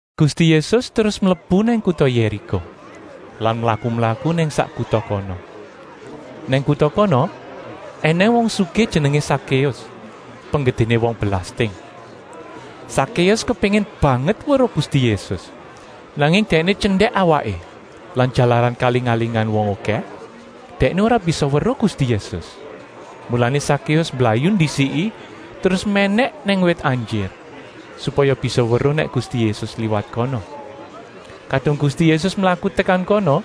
Gusti Yésus terus mlebu nang kuta Yériko lan mlaku-mlaku nang sak kuta kono. Nang kuta kono ènèng wong sugih jenengé Sakéus, penggedéné wong belasting. Sakéus kepéngin banget weruh Gusti Yésus. Nanging dèkné tyendèk awaké lan jalaran kaling-alingan wong okèh, dèkné ora bisa weruh Gusti Yésus. Mulané Sakéus mblayu ndisiki terus mènèk nang wit anjir, supaya bisa weruh nèk Gusti Yésus liwat kono. Kadung Gusti Yésus mlaku tekan kono,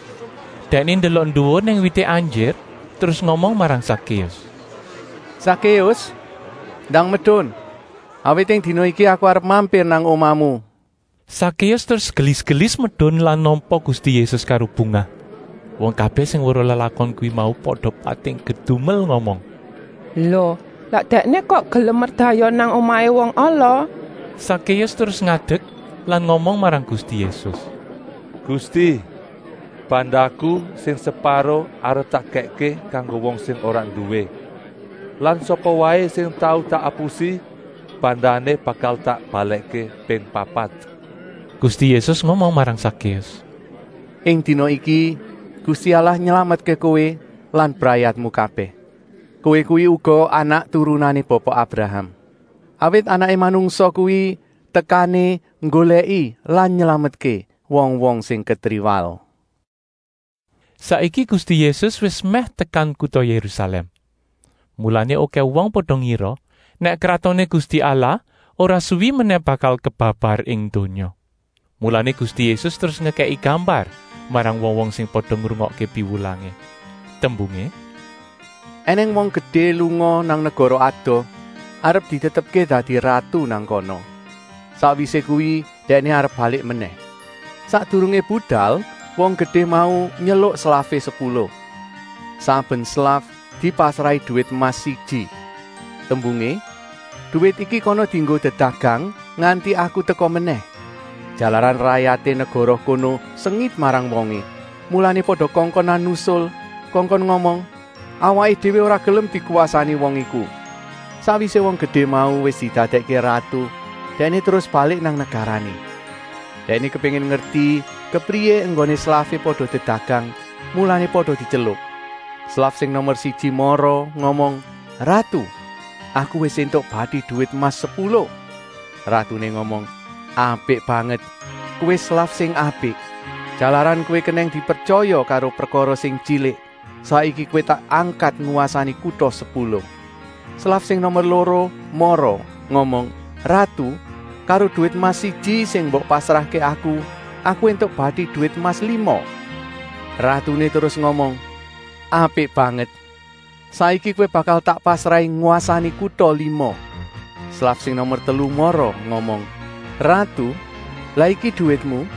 Dèkné ndelok nduwur nang wité anjir terus ngomong marang Sakéus: “Sakéus, ndang medun! Awit ing dina iki aku arep mampir nang omahmu.” Sakéus terus gelis-gelis medun lan nampa Gusti Yésus karo bungah. Wong kabèh sing weruh lelakon kuwi mau pada pating kedumel ngomong: “Lo, lah Dèkné kok gelem merdayoh nang omahé wong ala?” Sakéus terus ngadek lan ngomong marang Gusti Yésus: “Gusti, bandaku sing separo arep tak kèkké kanggo wong sing ora nduwé lan sapa waé sing tau tak apusi bandané bakal tak balèkké ping papat.” Gusti Yésus ngomong marang Sakéus: “Ing dina iki Gusti Allah nylametké kowé lan brayatmu kabèh. Kowé kuwi uga anak-turunané Bapa Abraham. Awit Anaké Manungsa kuwi tekané nggolèki lan nylametké wong-wong sing ketriwal.” Saiki Gusti Yésus wis mèh tekan kuta Yérusalèm, mulané okèh wong pada ngira nèk Kratoné Gusti Allah ora suwi menèh bakal kebabar ing donya. Mulané Gusti Yésus terus ngekèki gambar marang wong-wong sing pada ngrungokké piwulangé. Tembungé: “Enèng wong gedé lunga nang negara adoh arep ditetepké dadi ratu nang kana. Sakwisé kuwi dèkné arep balik menèh. Sakdurungé budal wong gedé mau nyeluk slafé sepuluh. Saben slaf dipasrahi duwit emas siji. Tembungé: ‘Duwit iki kana dienggo dedagang nganti aku teka menèh.’ Jalaran rayaté negara kono sengit marang wongé, mulané pada kongkonan nusul, kongkon ngomong: ‘Awaké déwé ora gelem dikwasani wong iku.’ “Sakwisé wong gedé mau wis didadèkké ratu, dèkné terus balik nang negarané. Dèkné kepéngin ngerti kepriyé enggoné slafé pada dedagang, mulané pada dityeluk. Slaf sing nomer siji mara ngomong: ‘Ratu, aku wis éntuk bati duwit emas sepuluh.’ Ratuné ngomong: ‘Apik banget, kowé slaf sing apik. Jalaran kowé kenèng dipretyaya karo prekara sing tyilik, saiki kowé tak angkat ngwasani kuta sepuluh.’ Slaf sing nomer loro mara ngomong: ‘Ratu, karo duwit emas siji sing mbok pasrahké aku, aku éntuk bati duwit emas lima.’ Ratuné terus ngomong: ‘Apik banget, saiki kowé bakal tak pasrahi ngwasani kuta lima.’ “Slaf sing nomer telu mara ngomong: ‘Ratu, lah iki duwitmu,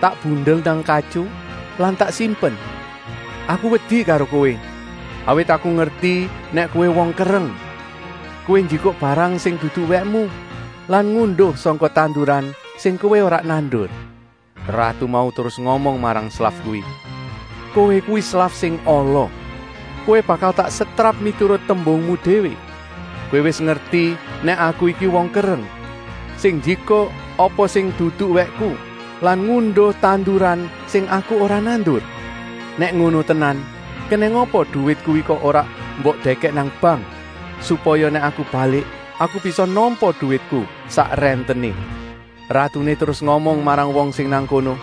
tak bundel nang katyu lan tak simpen. Aku wedi karo kowé, awit aku ngerti nèk kowé wong kereng. Kowé njikuk barang sing dudu wèkmu lan ngunduh sangka tanduran sing kowé ora nandur.’ Ratu mau terus ngomong marang slaf kuwi: ‘Kowé kuwi slaf sing ala, kowé bakal tak setrap miturut tembungmu déwé. Kowé wis ngerti nèk aku iku wong kereng, sing njikuk apa sing dudu wèkku lan ngunduh tanduran sing aku ora nandur. Nèk ngono tenan, kenèng apa duwit kuwi kok ora mbok dèkèk nang bank, supaya nèk aku balik aku bisa nampa duwitku sak rèntené?’ “Ratuné terus ngomong marang wong sing nang kono: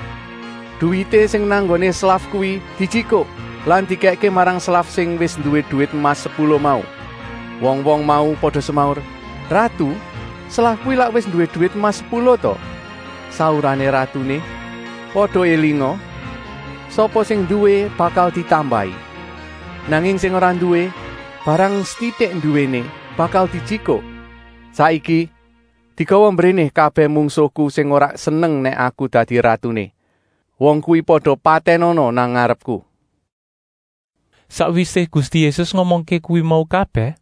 ‘Duwité sing nang nggoné slaf kuwi dijikuk lan dikèkké marang slaf sing wis nduwé duwit emas sepuluh mau.’ Wong-wong mau pada semaur: ‘Ratu, slaf kuwi lak wis nduwé duwit emas sepuluh, ta?’ Saurané ratuné: ‘Pada élinga, sapa sing nduwé bakal ditambahi, nanging sing ora nduwé, barang setitik nduwéné bakal dijikuk. Saiki, digawa mbréné kabèh mungsuhku sing ora seneng nèk aku dadi ratuné. Wong kuwi pada patènana nang ngarepku!’” Sakwisé Gusti Yésus ngomongké kuwi mau kabèh,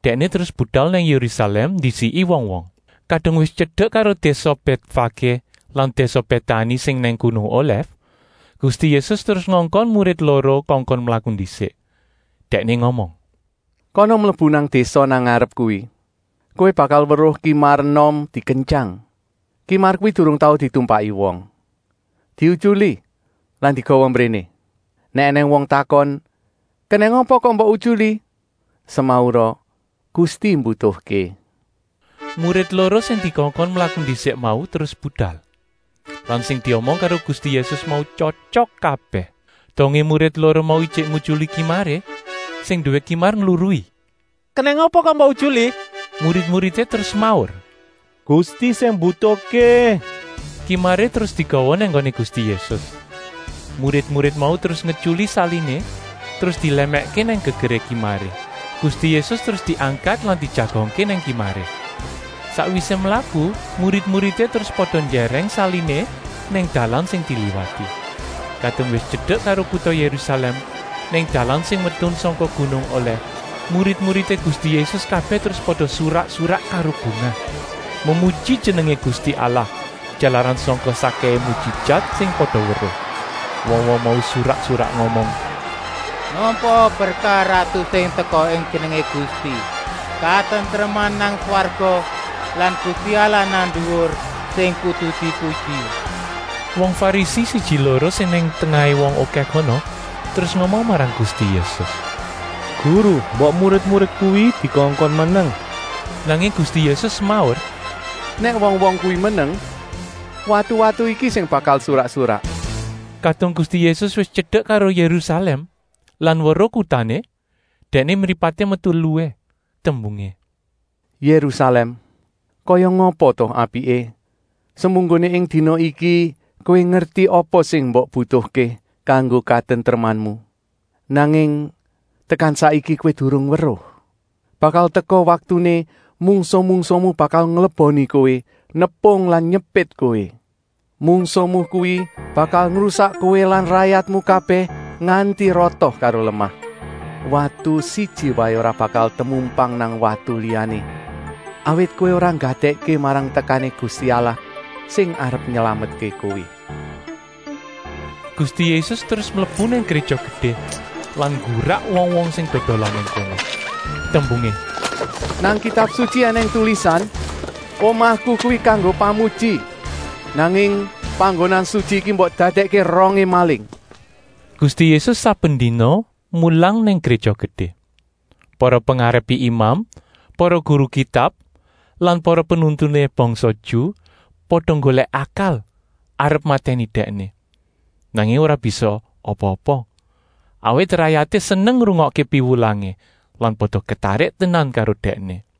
Dèkné terus budal nang Yérusalèm ndisiki wong-wong. Kadung wis tyedek karo désa Bètfaké lan désa Bétani sing nang gunung Olèf, Gusti Yésus terus ngongkon murid loro kongkon mlaku ndisik. Dèkné ngomong: “Kana mlebu nang désa nang ngarep kuwi. Kowé bakal weruh kimar enom dikentyang. Kimar kuwi durung tau ditumpaki wong. Diutyuli lan digawa mbréné. Nèk ènèng wong takon: ‘Kenèng apa kok mbok utyuli?’ Semaura: ‘Gusti mbutuhké.’” Murid loro sing dikongkon mlaku ndisik mau terus budal. Lan sing diomong karo Gusti Yésus mau tyotyok kabèh. Dongé murid loro mau ijik ngutyuli kimaré, sing nduwé kimar ngluruh: “Lah kenèng apa kok mbok utyuli?” Murid-muridé terus semaur: “Gusti sing mbutuhké.” Kimaré terus digawa nang nggoné Gusti Yésus. Murid-murid mau terus ngutyuli saliné, terus dilèmèkké nang gegeré kimaré. Gusti Yésus terus diangkat lan dijagongké nang kimaré. Sakwisé mlaku, murid-muridé terus pada njèrèng saliné nang dalan sing diliwati. Kadung wis tyedek karo kuta Yérusalèm, nang dalan sing medun sangka gunung Olèf, murid-muridé Gusti Yésus kabèh terus pada surak-surak karo bungah, memuji jenengé Gusti Allah, jalaran sangka sakkèhé mujijat sing pada weruh. Wong-wong mau surak-surak ngomong: “Nampaa berkah Ratu sing teka ing Jenengé Gusti! Katentreman nang swarga lan Gusti Allah nang nduwur sing kudu dipuji!” Wong Farisi siji-loro sing nang tengahé wong okèh kono terus ngomong marang Gusti Yésus: “Guru, mbok murid-murid kuwi dikongkon meneng!” Nanging Gusti Yésus semaur: “Nèk wong-wong kuwi meneng, watu-watu iki sing bakal surak-surak.” Kadung Gusti Yésus wis tyedek karo Yérusalèm lan weruh kutané, Dèkné mripaté metu eluhé. Tembungé: “Yérusalèm, kaya ngapa ta apiké semunggoné ing dina iki kowé ngerti apa sing mbok butuhké kanggo katentremanmu. Nanging tekan saiki kowé durung weruh. Bakal teka waktuné mungsuh-mungsuhmu bakal ngleboni kowé, nepung lan nyepit kowé. Mungsuhmu kuwi bakal ngrusak kowé lan rayatmu kabèh nganti rata karo lemah. Watu siji waé ora bakal temumpang nang watu liyané, awit kowé ora nggatèkké marang tekané Gusti Allah sing arep nylametké kowé!” Gusti Yésus terus mlebu nang Gréja Gedé lan nggurak wong-wong sing dodolan nang kono. Tembungé: “Nang Kitab Sutyi ènèng tulisan: ‘Omahku kuwi kanggo pamuji,’ nanging panggonan sutyi iki mbok dadèkké rongé maling.” Gusti Yésus saben dina mulang nang Gréja Gedé. Para pengarepé imam, para guru Kitab lan para penuntuné bangsa Ju pada nggolèk akal arep matèni Dèkné, nanging ora bisa apa-apa, awit rayaté seneng ngrungokké piwulangé lan pada ketarik tenan karo Dèkné.